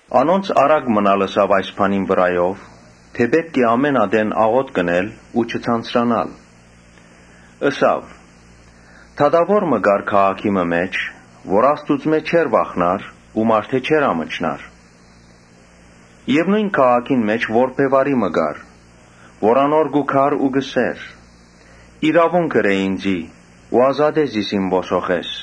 Անոնց առակ մըն ալ ըսաւ այս բանին վրայով՝ թէ պէտք է ամէն ատեն աղօթք ընել ու չձանձրանալ։ Ըսաւ. «Դատաւոր մը կար քաղաքի մը մէջ, որ Աստուծմէ չէր վախնար ու մարդէ չէր ամչնար։ Եւ նոյն քաղաքին մէջ որբեւարի մըն ալ կար, որ անոր կու գար ու կ’ըսէր. ‘Իրաւունք ըրէ ինծի ու ազատէ զիս իմ ոսոխէս’։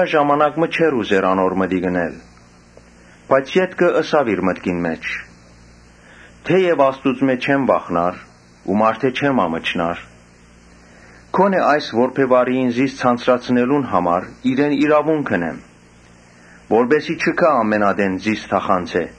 Ժամանակ մը դատաւորը չէր ուզեր անոր մտիկ ընել. բայց ետքը ըսաւ իր մտքին մէջ. ‘Թէեւ Աստուծմէ չեմ վախնար ու մարդէ չեմ ամչնար, Գոնէ այս որբեւարիին՝ զիս ձանձրացնելուն համար՝ իրեն իրաւունք ընեմ, որպէս զի չի գայ ամէն ատեն ինծի թախանձէ’»։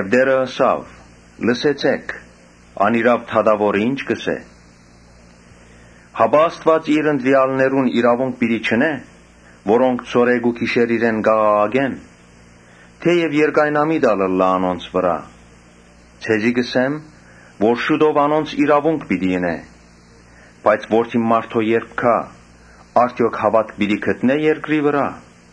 Տէրը ըսաւ. «Լսեցէ՛ք, անիրաւ դատաւորը ի՞նչ կ’ըսէ։ Հապա Աստուած իր ընտրեալներուն իրաւունք պիտի չընէ՞, որոնք ցորեկ ու գիշեր իրեն կ’աղաղակեն, թէեւ երկայնամիտ ալ ըլլայ։ Ձեզի կ’ըսեմ թէ շուտով անոնց իրաւունք պիտի ընէ. բայց Որդին մարդոյ երբ գայ, արդեօք հաւատք պիտի գտնէ՞ երկրի վրայ»։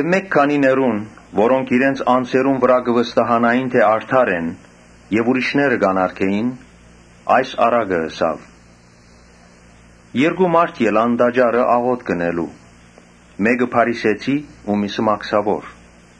Մէկ քանիներուն՝ որոնք իրենց անձերուն վրայ կը վստահէին՝ թէ արդար են եւ ուրիշները կ’անարգէին՝ այս առակը ըսաւ. «Երկու մարդ գացին տաճարը՝ աղօթք ընելու։ Մէկը փարիսեցի ու միւսը՝ մաքսաւոր։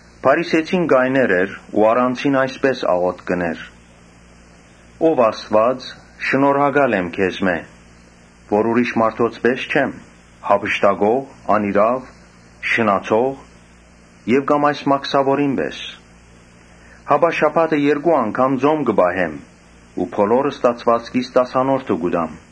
Փարիսեցին կայներ էր ու առանձին այսպէս աղօթք կ’ընէր. ‘Ով Աստուած, շնորհակալ եմ քեզմէ, որ ուրիշ մարդոց պէս չեմ, յափշտակող, անիրաւ, շնացող եւ կամ այս մաքսաւորին պէս, Հապա շաբաթը երկու անգամ ծոմ կը պահեմ ու բոլոր ստացուածքիս տասանորդը կու տամ’։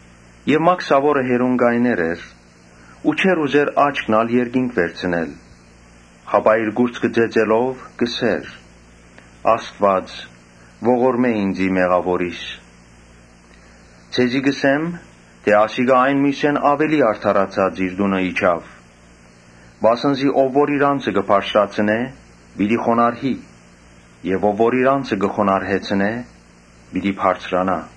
Իսկ մաքսաւորը հեռուն կայներ էր ու չէր ուզեր աչքն ալ երկինք վերցնել, հապա իր կուրծքը ծեծելով կ’ըսէր. ‘Ա՛ստուած, ողորմէ ինծի՝ մեղաւորիս’։ Ձեզի կ’ըսեմ թէ ասիկա այն միւսէն աւելի արդարացած իր տունը գնաց, վասն զի ով որ իր անձը կը բարձրացնէ՝ պիտի խոնարհի եւ ով որ իր անձը կը խոնարհեցնէ՝ պիտի բարձրանայ»։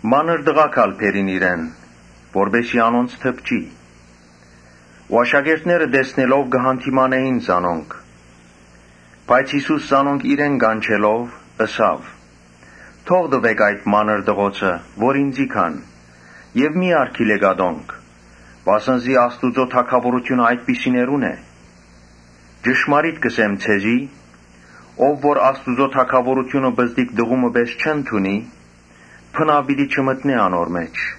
Մանր տղաք ալ բերին իրեն, որպէս զի անոնց դպչի։ Աշակերտները տեսնելով՝ կը յանդիմանէին զանոնք։ Բայց Յիսուս զանոնք իրեն կանչելով՝ ըսաւ. «Թող տուէք այդ մանր տղոցը որ ինծի գան եւ մի՛ արգիլէք ատոնք, վասն զի Աստուծոյ թագաւորութիւնը այդպիսիներունն է։ Ճշմարիտ կ’ըսեմ ձեզի, Ով որ Աստուծոյ թագաւորութիւնը պզտիկ տղու մը պէս չընդունի, բնաւ պիտի չմտնէ անոր մէջ»։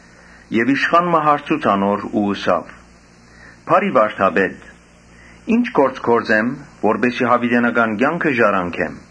Իշխան մը հարցուց անոր ու ըսաւ. «Բարի՛ վարդապետ, ի՞նչ գործ գործեմ, որպէս զի յաւիտենական կեանքը ժառանգեմ»։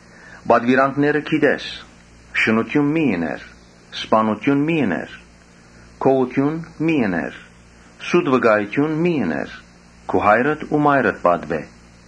Պատուիրանքները գիտես. Շնութիւն մի՛ ըներ, Սպաննութիւն մի՛ ըներ, Գողութիւն մի՛ ըներ, Սուտ վկայութիւն մի՛ ըներ, Քու հայրդ ու մայրդ պատուէ»։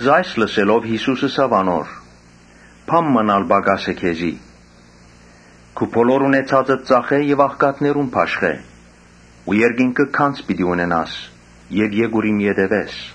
Այս լսելով Յիսուս ըսաւ անոր. «Բան մը պակաս է քեզի. քու բոլոր ունեցածդ ծախէ եւ աղքատներուն բաշխէ ու երկինքը գանձ պիտի ունենաս եւ եկուր իմ ետեւէս»։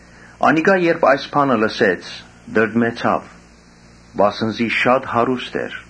Անիկա երբ այս բանը լսեց, տրտմեցաւ, վասն զի շատ հարուստ էր։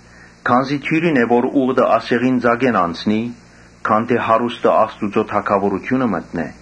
Քանզի աւելի դիւրին է, որ ուղտը ասեղին ծակէն անցնի, քան թէ հարուստը Աստուծոյ թագաւորութիւնը մտնէ»։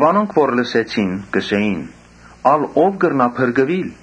Անոնք, որ լսեցին, ըսին. «Ալ ո՞վ կրնայ փրկուիլ»։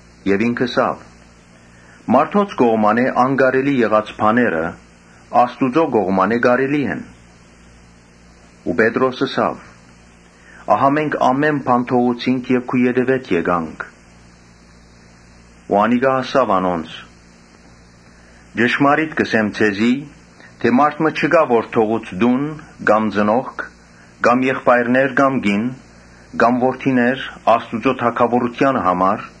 Ինք ըսաւ. «Մարդոց կողմէ անկարելի եղած բաները Աստուծոյ կողմէ կարելի են»։ Պետրոս ըսաւ. «Ահա մենք ամէն բան թողուցինք եւ քու ետեւէդ եկանք»։ Անիկա ըսաւ անոնց. «Ճշմարիտ կ’ըսեմ ձեզի թէ՝ ‘Մարդ մը չկայ որ թողու տուն, կամ ծնողք, կամ եղբայրներ, կամ կին, կամ որդիներ Աստուծոյ թագաւորութեանը համար,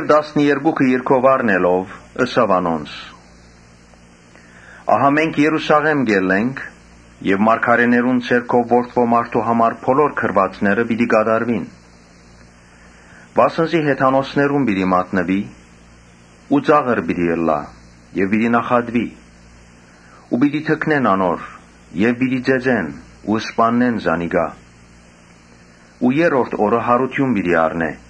Տասներկուքը իր քով առնելով՝ ըսաւ անոնց. «Ահա մենք Երուսաղէմ կ’ելլենք եւ մարգարէներուն ձեռքով Որդի մարդոյ համար բոլոր գրուածները պիտի կատարուին։ Վասն զի հեթանոսներուն պիտի մատնուի ու ծաղր պիտի ըլլայ եւ պիտի նախատուի ու պիտի թքնեն անոր վրայ Եւ պիտի ծեծեն ու սպաննեն զանիկա, բայց երրորդ օրը յարութիւն պիտի առնէ»։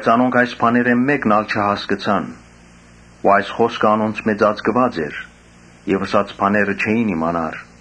Անոնք այս բաներէն մէկն ալ չհասկցան։ Ու այս խօսքը անոնցմէ ծածկուած էր եւ ըսած բաները չէին իմանար։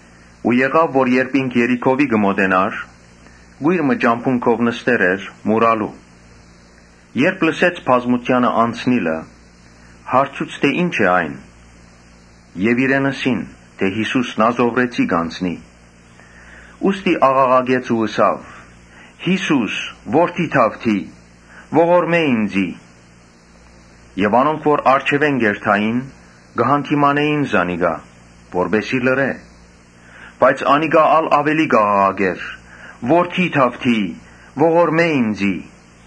Օր մը երբ ինք Երիքովի կը մօտենար, կոյր մը ճամբուն քով նստեր էր մուրալու։ Երբ լսեց բազմութեանը անցնիլը, հարցուց թէ ‘Ի՞նչ է այն’։ Իրեն ըսին թէ ‘Յիսուս Նազովրեցին կ’անցնի’։ Ան ալ աղաղակեց ու ըսաւ. «Յիսո՛ւս, Որդի՛ Դաւթի, ողորմէ ինծի»։ Անոնք որ առջեւէն կ’երթային, կը յանդիմանէին զանիկա, որպէս զի լռէ, բայց անիկա ալ աւելի կ’աղաղակէր. «Որդի՛ Դաւթի, ողորմէ՛ ինծի»։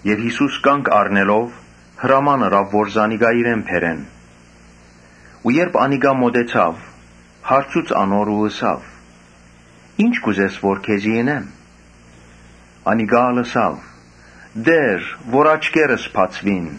Յիսուս կանգ առնելով՝ հրաման ըրաւ որ զանիկա իրեն բերեն ու երբ անիկա մօտեցաւ, հարցուց անոր ու ըսաւ. «Ի՞նչ կ’ուզես որ քեզի ընեմ»։ Անիկա ալ ըսաւ. «Տէր, կ’ուզեմ որ աչքերս բացուին»։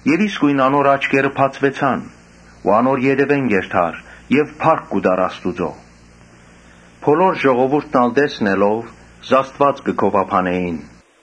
Եւ իսկոյն անոր աչքերը բացուեցան ու անոր ետեւէն կ’երթար եւ փառք կու տար Աստուծոյ։ Բոլոր ժողովուրդն ալ տեսնելով՝ Աստուած կը գովաբանէին։